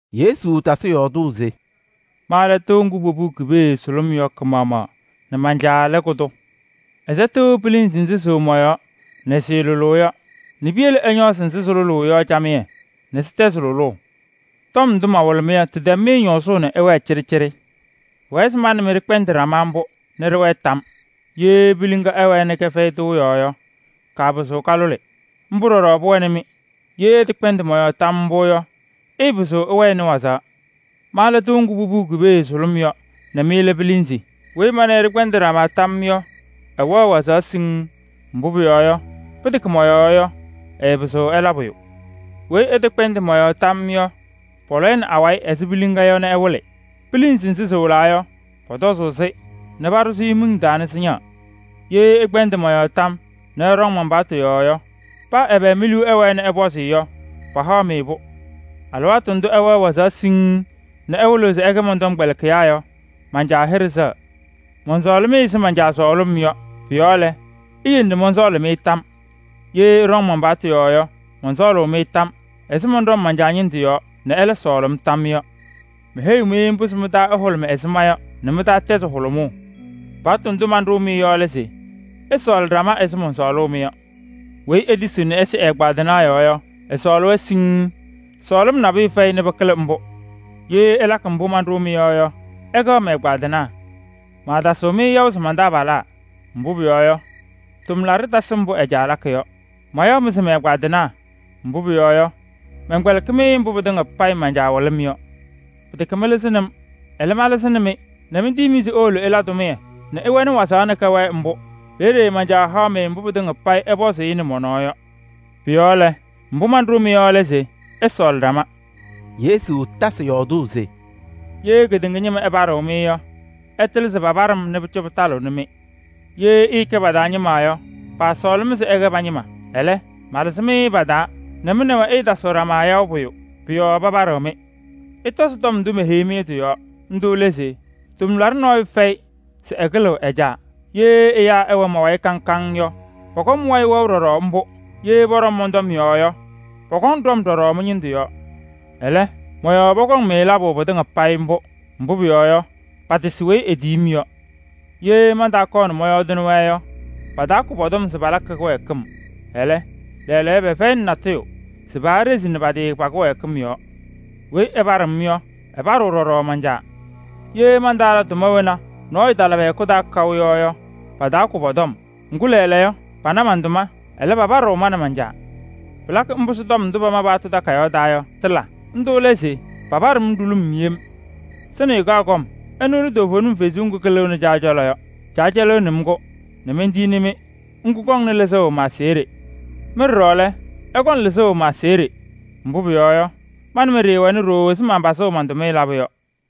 Yesu tasɩ yɔɔdʋʋ se: “Ma lɛ tɩʋ ŋgʋ popuu ki-pee sʋlʋm yɔ kɩ-maɣmaɣ nɛ man-Caa lɛ kʋ-tʋ. Ɛsɛtɩɣ pilinzi nzɩ sɩwɛ mɔ-yɔɔ nɛ sɩɩlʋlʋʋ yɔ nɛ piyele ɛñɔɔzɩ nzɩ sɩlʋlʋʋ yɔ camɩyɛ nɛ sɩtɛzɩ lʋlʋʋ. Tɔm ndʋ mawɩlɩ-mɩ yɔ, tɩtɛm-mɩ ñɔɔzʋʋ nɛ ɩwɛɛ cɩɖɩcɩɖɩ. Pʋwɛɛ se ma nɛ mɩ ɖɩkpɛndɩ ɖama mbʋ nɛ ɖɩwɛɛ tam yɔɔ. Ye piliŋa ɛwɛɛ nɛ kɛfɛyɩ tɩʋ yɔɔ yɔ, kaapɩzɩɣ kalʋlɩ. Mbʋ ɖɔɖɔ pʋwɛnɩ-mɩ, ye ɩtɛkpɛndɩ mɔ-yɔɔ mbʋ tam yɔɔ yɔ, ɩɩpɩzɩɣ ɩwɛnɩ wazaɣ. Ma lɛ tɩʋ ŋgʋ popuu ki-pee sʋlʋm yɔ nɛ mɩ lɛ pilinzi. Weyi ma nɛ ɩ ɖɩkpɛndɩ ɖama tam yɔɔ yɔ, ɛwɛɣ wazaɣ siŋŋ. Mbʋ pʋyɔɔ yɔ, pɩtɛkɛ mɔ-yɔɔ yɔ, ɩɩpɩzɩɣ ɩla pʋyʋ. Weyi ɛtɛkpɛndɩ mɔ-yɔɔ tam yɔɔ yɔ, pɔlɔ-ɩ nɛ awayɩ ɛzɩ piliŋa yɔ nɛ ɛwɩlɩ. Pilinzi nzɩ sɩwɩlaa yɔ, pɔtɔzʋʋ-sɩ nɛ paɖʋ miŋ taa nɛ sɩñaɣ. Ye ɩkpɛndɩ mɔ-yɔɔ tam yɔɔ nɛ ɩɖɔŋ mɔn-tɔm yɔɔ yɔ, paa ɛbɛ mi-liu ɛwɛɛ nɛ ɩpɔzɩ yɔ, pahaɣ-mɩ-pʋ. Alɩwaatʋ ndʋ ɩwɛɣ wazaɣ siŋŋ nɛ ɩwɩlɩɣ se ɩkɛ mɔn-tɔmkpɛlɩkɩyaa yɔ, man-Caa hɩɖɛ sɛɣ. Mɔnsɔɔlɩ-mɩ ɛzɩ Caa sɔɔlʋʋ-m yɔ. Pʋ-yɔɔ lɛ, iyele nɛ mɔnsɔɔlɩ-mɩ tam yɔɔ. Ye ɩɖɔŋ man-paɣtʋ yɔɔ yɔ, mɔnsɔɔlʋʋ-mɩ tam yɔɔ ɛzɩ mɔnɖɔm man-Caa ñɩndʋ yɔɔ nɛ ɛlɛ sɔɔlɩ-m tam yɔɔ yɔ. Meheyi-mɩ mbʋ se mɩ-taa ɛhʋlʋmɩ ɛzɩ ma yɔ nɛ mɩ-taa tɛzɩ hʋlʋmʋʋ. Paɣtʋ ndʋ manɖʋʋ-mɩ yɔ lɛ se: ɩsɔɔlɩ ɖama ɛzɩ mɔnsɔɔlʋʋ-mɩ yɔ. Weyi etisiɣ nɛ ɛsɩ ɛ-ɛgbaadɩnaa yɔɔ yɔ, ɛsɔɔlɩ-wɛ siŋŋ. Sɔɔlɩm nabʋyʋ fɛyɩ nɛ pɩkɩlɩ mbʋ. Ye ɩlakɩ mbʋ manɖʋʋ-mɩ yɔ yɔ, ɩkɛɣ mɛ-ɛgbaadɩnaa. Maatasɩɣ-mɩ yaʋ se man-tʋmlaɖaa, mbʋ pʋyɔɔ yɔ, tʋmlaɖʋ tasɩ mbʋ ɛ-caa lakɩ yɔ. Mayaɣ-mɩ se mɛ-ɛgbaadɩnaa, mbʋ pʋyɔɔ yɔ, mɛnkpɛlɩkɩ-mɩ mbʋ pɩtɩŋa payɩ man-Caa wɩlɩ-m yɔ. Pɩtɛkɛ mɩlɩzɩnɩ-m, ɛlɛ, ma malɩzɩnɩ-mɩ nɛ mentiyi-mɩ se iwolo ɩla tʋmɩyɛ nɛ ɩwɛnɩ wazaɣ nɛ kɛwɛɛ mbʋ. Peeye man-Caa haɣ-mɩ mbʋ pɩtɩŋa payɩ ɩpɔzʋʋ-ɩ nɛ mɔ-nɔɔ yɔ. Pʋ-yɔɔ lɛ, mbʋ manɖʋʋ-mɩ yɔ lɛ se: ɩsɔɔlɩ ɖama.” Yesu tasɩ yɔɔdʋʋ se: “Ye kedeŋa ñɩma ɛpaɖɩɣ-mɩ yɔ, ɩtɩlɩ se papaɖɩ-m nɛ pʋcɔ pɩtalɩɣnɩ-mɩ. Ye ɩɩkɛ pa-taa ñɩma yɔ, paasɔɔlɩ-mɩ se ɩkɛ pa-ñɩma. Ɛlɛ, malɩzɩ-mɩ pa-taa nɛ mɩ nɛ wɛ ɩɩyaɣ ɖama pʋyʋ, pʋ-yɔɔ papaɖɩɣ-mɩ mbʋ. Ɩtɔzɩ tɔm ndʋ meheyi-mɩ yɔ tɩ-yɔɔ. Ndʋ lɛ se: ‘Tʋmlaɖʋ nɔɔyʋ fɛyɩ se ɛkɩlɩɣ ɛ-caa.’ Ye ɛyaa ɛwɛ ma-wayɩ kaŋ kaŋ yɔ, pɔkɔŋ mɩ-wayɩ wɛʋ ɖɔɖɔ mbʋ. Ye pɔɖɔm mɔn-tɔm yɔɔ yɔ, pɔkɔŋ ɖɔm ɖɔɖɔ mɩ-ñɩndʋ yɔɔ. Ɛlɛ, mɔ-yɔɔ pɔkɔŋ-mɩ labʋ pɩtɩŋa payɩ mbʋ. Mbʋ pʋyɔɔ yɔ, patasɩ weyi etiyi-m yɔ. Ye mantaakɔɔ nɛ mɔyɔɔdɩnɩ-wɛ yɔ, pataakʋ pɔ-tɔm se palakɩ kɩwɛɛkɩm. Ɛlɛ, lɛɛlɛɛyɔ, pɛfɛyɩnɩ natʋyʋ se paaɖezini pa-tɩ pa-kɩwɛɛkɩm yɔɔ. Weyi ɛpaɖɩɣ-m yɔ, ɛpaɖɩɣ ɖɔɖɔ man-Caa. Ye mantaala tʋma wena nɔɔyʋ tala pɛ-hɛkʋ taa kaʋ yɔ yɔ, pataakʋ pɔ-tɔm. Ŋgʋ, lɛɛlɛɛyɔ pana man-tʋma, ɛlɛ, papadɩɣ ma nɛ man-Caa. Pɩlakɩ mbʋ se tɔm ndʋ pama pa-paɣtʋ takayaɣ taa yɔ, tɩla. Ndʋ lɛ se: ‘Papaɖɩ-m ɖulum yem.’ Sɩnɩyʋ kaɣ kɔm: ɛnʋ lɛ toovenim Kalɩzaɣ ŋga kalɩɣnɩ Caa cɔlɔ yɔ. Caa cɛlɩɣnɩ-m-kɛ nɛ mentiyini-mɩ, ŋga kɔŋnɩ lɩzʋʋ ma-aseɣɖe. Mɩ ɖɔɖɔ lɛ, ɩkɔŋ lɩzʋʋ ma-aseɣɖe, mbʋ pʋyɔɔ yɔ, ma nɛ mɩ ɖɩɩwɛnɩ ɖooo ɛzɩ manpazʋʋ man-tʋmɩyɛ labʋ yɔ.